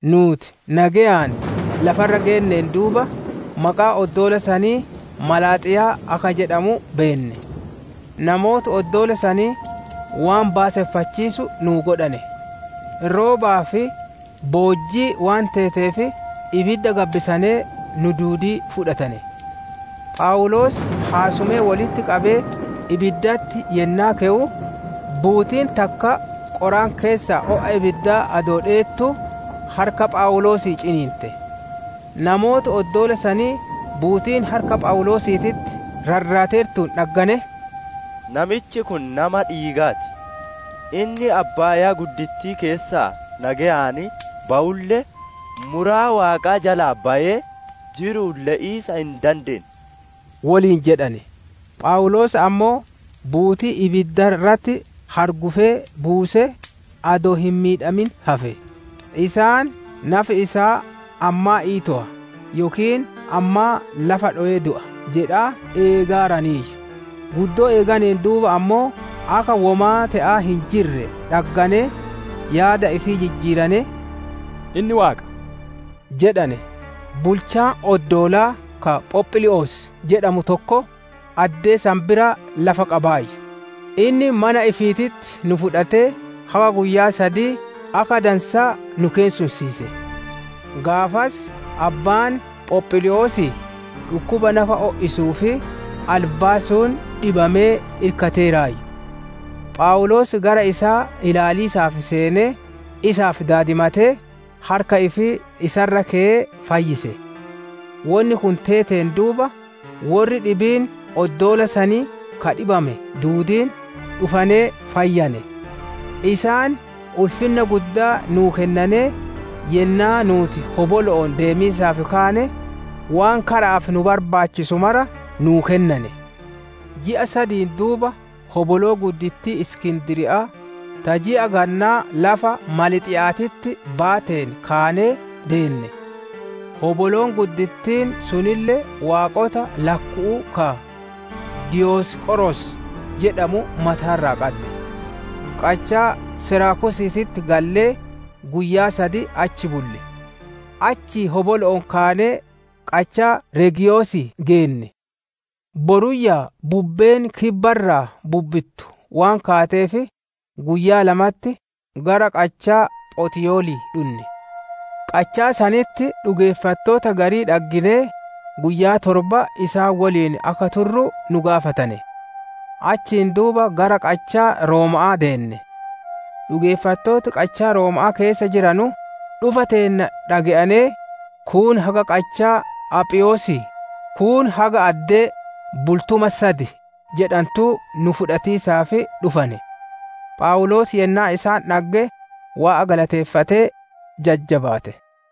Nuuti nageyaan lafa irra geenneen duuba, maqaan oddoola sanii Malaaxiyaa akka jedhamu beenne. Namooti oddoola sanii, waan baaseffachiisu nuu godhane; roobaa fi boojjii waan teeteef, ibidda gabbisanee nu duudii fudhatane. Phawuloos haasumee wolitti qabee ibiddatti yennaa kewu, buutiin takka qoraan keessaa o'a ibiddaa adoo dheettuu, harka Phawuloosii ciniinte. Namooti oddoola sanii, buutiin harka Phawuloosiititti rarrateertuun dhagganee, «Namichi kun nama dhiigaa ti; inni abbaayaa keessaa nageyaan bawulle, muraa Waaqaa jalaa bayee, jiru'uun le'iisa hin dandeenne» woliin jedhane. Phawuloos ammoo, buutii ibidda irratti hargufee buusee, adoo hin miidhamin hafe. Isaan, «Nafi isaa ammaa iitowa yookiin ammaa lafa dhowee du'a» jedhaa eegaaraniiyyu. Guddoo eeganeen duuba ammoo akka womaa te'aa hin jirre dhagganee, yaada ifii jijjiiranee, «Inni waaqa» jedhane. Bulchaan oddoolaa ka Phophlii'os jedhamu tokko, addee san biraa lafa qabaayyu; inni mana ifiititti nu fudhatee, haga guyyaa sadii akka dansaa nu keessumsiise. Gaafas abbaan Phophlii'osii dhukkuba nafa o'isuu fi albaasuun dhibamee irkateeraayyu. Phawuloos gara isaa ilaaliisaaf seenee, isaaf daadimatee, harka ifii isa irra keyee fayyise. Wonni kun teeteen duuba, worri dhibiin oddoola sanii ka dhibamane duudiin, dhufanee fayyane. Isaan ulfinna guddaa nu kennanee, yennaa nuuti hobolo'oon deemiisaaf kaane, waan kara'aaf nu barbaachisu mara nuu kennane. Ji'a sadiin duuba hoboloo guddittii Iskindiriya'aa, ta ji'a gannaa lafa Maalxiya'aatitti baateen kaanee deenne; hoboloon guddittiin sunille waaqota lakku'uu ka, «Diyoosqoros» jedhamu mataa irraa qaddi. Qachaa Seraakusiititti gallee, guyyaa sad achi bulle. Achii hobolo'oon kaanee, qachaa Reegiyosii geenne. Boruyyaa bubbeen kibba irraa bubbittu waan kaateef, guyyaa lamatti gara qachaa Photiyolii dhunne. Qachaa sanitti dhugeeffattoota garii dhagginee, guyyaa torba isaan woliin akka turru nu gaafatane; achiin duuba gara qachaa Rooma'aa deenne. Dhugeeffattooti qachaa Rooma'aa keessa jiranu, dhufa teenna dhage'anee, kuun haga qachaa Aphiyosii, kuun haga addee «Bultuma sad» jedhantuu nu fudhatiisaaf dhufane. Phawuloos yennaa isaan dhagge, Waaqa galateeffatee, jajjabaate.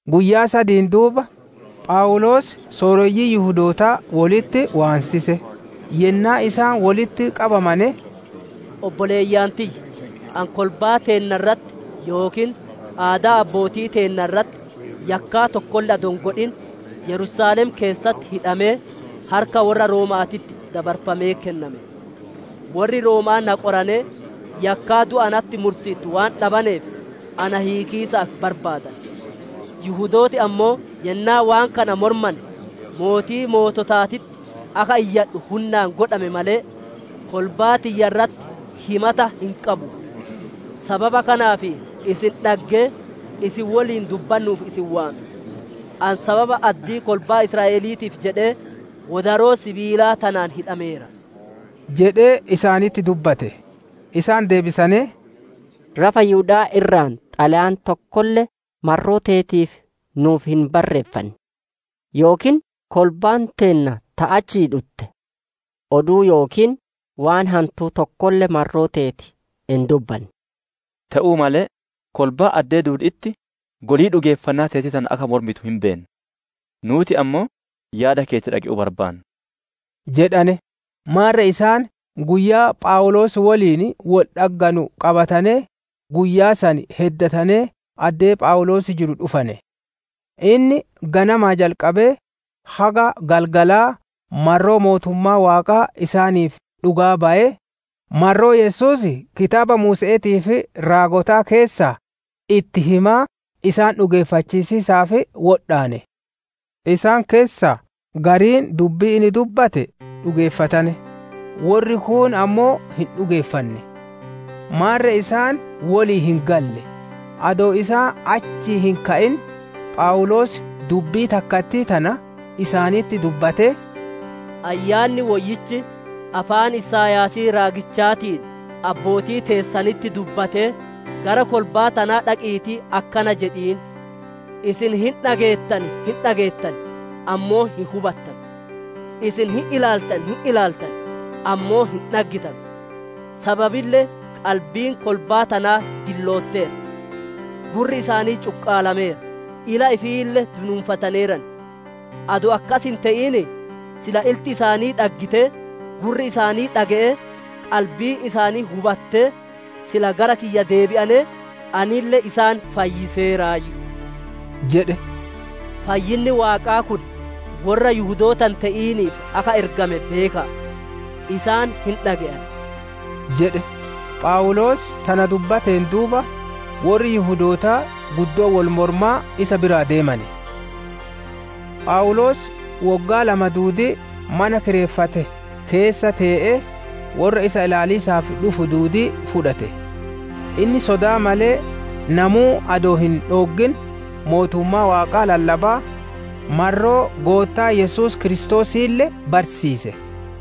Guyyaa sadiin duuba, Phawuloos sooreyyii Yihudootaa wolitti waansise. Yennaa isaan wolitti qabamane, «Obboleeyyan tiyya; ani kolbaa teenna irratti yookiin aadaa abbootii teennaa irratti yakkaa tokkolle adoo hin godhin, Yerusaalem keessatti hidhamee, harka worra Rooma'aatitti dabarfamee kenname. Worri Rooma'aa na qoranee, yakkaa du'a natti mursiittu waan dhabaneef, na hiikiisaaf barbaadane. Yihudooti ammoo yennaa waan kana mormane, Mootii Moototaatitti akka iyyadhu hunnaan godhame malee, kolbaa tiyya irratti himata hin qabu. Sababa kanaaf isin dhaggee, isin woliin dubbannuuf isin waame. Ani sababa addii kolbaa Israa'eliitiif jedhee wodaroo sibiilaa tanaan hidhameera» jedhee isaanitti dubbatte. Isaan deebisanee, «Lafa Yihuda'aa irraa xalayaan tokkolle marroo teetiif nuuf hin barreeffanne; yookiin kolbaan teenna ta achii dhutte oduu yookiin waan hantuu tokkolle marroo teeti hin dubbanne. Te'uu malee kolbaan addee duudi'itti golii dhugeeffannaa teetii tana akka mormitu hin beenna; nuuti ammoo yaada keeti dhage'uu barbaanna» jedhane. Maarre isaan guyyaa Phawuloos woliin wol dhagganu qabatanee, guyyaa san heddatanee addee Phawuloos jiru dhufane. Inni ganamaa jalqabee haga galgalaa marroo Mootummaa Waaqaa isaaniif dhugaa bayee, marroo Yesuusii kitaaba Muuse'eetii fi raagotaa keessaa itti himaa isaan dhugeeffachiisiisaaf wodhaane. Isaan keessaa gariin dubbii inni dubbate dhugeeffatane, worri kuun ammoo hin dhugeeffanne. Maarre isaan wolii hin galle; adoo isaan achii hin ka'in, Phawuloos dubbii takkattii tana isaanitti dubbatee, «Ayyaanni Woyyichi afaan Isaayaasii raagichaatiin abbootii teessanitti dubbatee, « ‹Gara kolbaa tanaa dhaqiitii: Isin hin dhageettan hin dhageettan, ammoo hin hubattanu: Isin hin ilaaltan hin ilaaltan, ammoo hin dhaggitanu jedhiin. Sababille qalbiin kolbaa tanaa dillootteerti; gurri isaanii cuqqalameera; ila ifiille dunuunfataneeran. Adoo akkas hin te'inii, silaa ilti isaanii dhaggitee, gurri isaanii dhage'ee, qalbiin isaanii hubattee, sila gara kiyya deebi'anee, anille isaan fayyiseeraayyu› jedhe. «Fayyinni Waaqaa kun worra Yihudoota hin te'iniif akka ergame beeka'a. Isaan hin dhage'an» jedhe. [ Phawuloos tana dubbateen duuba, worri Yihudootaa guddoo wol moromaa isa biraa deemane.] Phawuloos woggaa lama duudii mana kireeffate keessa tee'ee, worra isa ilaaliisaaf dhufu duudii fudhate. Inni sodaa malee, namuu adoo isa hin dhooggin mootummaa Waaqaa lallabaa, marroo Goottaa Yesuus Kiristoosiille barsiise.